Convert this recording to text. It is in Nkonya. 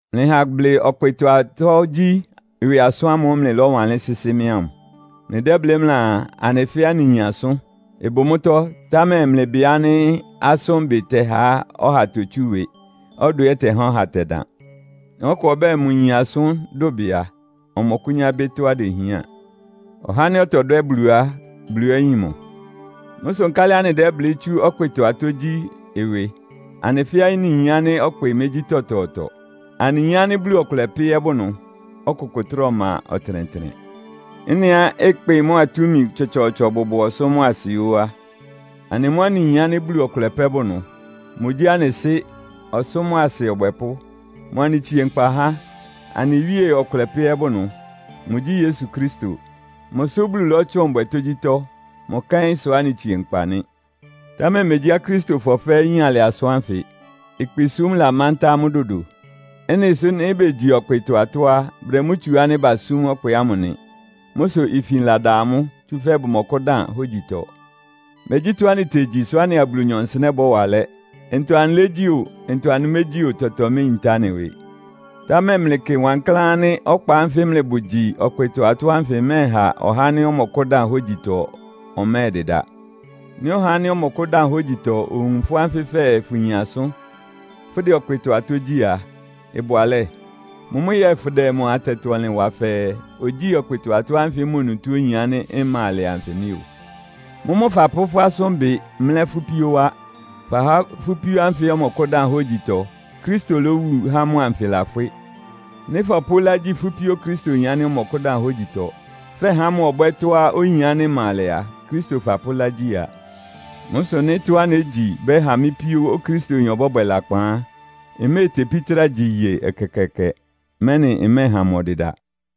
Mlɩha ablɩ ɔkpɩtɔ-atɔ́ gyí ɩwɩ asʋ́n ámʋ́ʋ́ mlɩlɔ́wanlɩ́n sɩ́sɩ́ mɩ́ ámʋ. Mlɩdɛ́blɩ́ mlɩaa, “Anɩ fɛ́ɛ́ anɩyin asʋ́n.” Ɩbʋ mʋ́tɔ́, támɛ mlɩbɩ ánɩ́ asʋ́nbɩ tɛhá ɔha totsú ɩwɩ, ɔdwɛ ɛ́ ɩtɛhá ɔha tɛdan. Nɩ́ ɔkʋ ɔbɛ́ɛ, mʋyin asʋ́n dʋbɩ a, ɔmɔkʋ́nyá bɩ́ tɔ́á idehián. Ɔhá ánɩ́ ɔtɔdwɛ́ Bulu á, Bulu ɛ́ yin mʋ. Mʋ́ sʋ nkálɩ anɩdɛ́blɩ́ tsú ɔkpɩtɔ atɔ́ gyí ɩwɩ? Anɩ fɛ́ɛ́ anɩyin ánɩ́ ɔkpɩ mégyí tɔtɔɔtɔ. Anɩyin ánɩ́ Bulu ɔkʋlɛ pɛ́ ɛ́ bʋ ɩnʋ, ɔkʋkʋ trá ɔma ɔtɩnɛtɩnɛ. Ɩ́nɩá ɩkpɩ mʋ́a túmi tsɔtsɔɔtsɔ bʋbʋ ɔsʋ́ mʋ́a asɩ ó á, anɩ mʋ́ anɩyin ánɩ́ Bulu ɔkʋlɛ pɛ́ bʋ ɩnʋ. Mʋgyí anɩ Sɩ́, ɔsʋ́ mʋ́a asɩ Ɔbwɛpʋ́. Mʋ anɩtsie nkpa há. Anɩ Wíe ɔkʋlɛ pɛ́ ɛ́ bʋ ɩnʋ. Mʋgyí Yesu Kristo. Mʋsʋ Bulu lɔ́tsʋn bwɛ tógyítɔ́. Mʋ kɛ́n sʋ anɩtsie nkpa nɩ́. Támɛ megyí Akristofɔ fɛ́ɛ́ yín alɩ asʋ́n ánfɩ. Ɩkpɩsúm lamántá amʋ́ dodo. Ɩ́nɩ sʋ nɩ́ begyi ɔkpɩtɔ-atɔ́ á, bʋdɛ mʋ́ tsu ánɩ́ basúm ɔkpɩ ámʋ nɩ. Mʋ́ sʋ ifin lada amʋ́, tsúfɛ́ bʋmɔkʋ́dan hógyitɔ. Megyí tɔ́á anɩtegyi sʋ́ anɩa Bulunyɔ nsɩnɛ́ bɔ́wa alɛ́. Ntɔ anɩlégyí o, ntɔ anɩmégyí o, tɔtɔ meyintá anɩ ɩwɩ. Támɛ mlɩkɩ wankláán ánɩ́ ɔkpa ánfɩ mlɩbʋ gyi ɔkpɩtɔ-atɔ́ ánfɩ ɩmɛ́ɛha ɔhá ánɩ́ ɔmɔkʋ́dan hógyitɔ ɔmɛ́ɛdɩda. Nɩ́ ɔhá ánɩ́ ɔmɔkʋ́dan hógyitɔ owun fʋ́ ánfɩ fɛɛ fʋyin asʋ́n, fʋdɛ atɔ́ gyí ɔkpɩtɔ á, ɩbʋ alɛ́? Mʋ́mʋ́ yɛ́ɛ fʋdɛ mʋ atɛtɔ-ɔnlɩn wa fɛɛ, ogyíi ɔkpɩtɔ atɔ́ ánfɩ mʋ onutó oyin ánɩ́ ɩma alɛ anfɩ nɩ́ o. Mʋ́mʋ́ fapʋ́ fʋ́ asʋ́nbɩ mlɛ́ fʋ́ píó wá. Fahá fʋ́ píó ánfɩ ɔmɔkʋ́dan hógyitɔ, Kristo lówu há mʋ anfɩ lafwɩ́. Nɩ́ fɔpʋ́ ɩlá gyi fʋ́ píó Okristoyin ánɩ́ ɔmɔkʋ́dan hógyitɔ, fɛhá mʋ ɔbwɛ́ tɔ́á oyin ánɩ́ ɩma alɛ á, Kristo fapʋ́ ɩlá gyi a. Mʋ́ sʋ nɩ́ tɔ́á négyi ɩbɛ́ha mɩ́ píó Okristoyin ɔbɔ́bwɛ lakpan á, mméetepí trá gyi iye ɛkɛkɛɛkɛ, mɛ́nɩ ɩmɛ́ɛha mʋ ɔdɩda.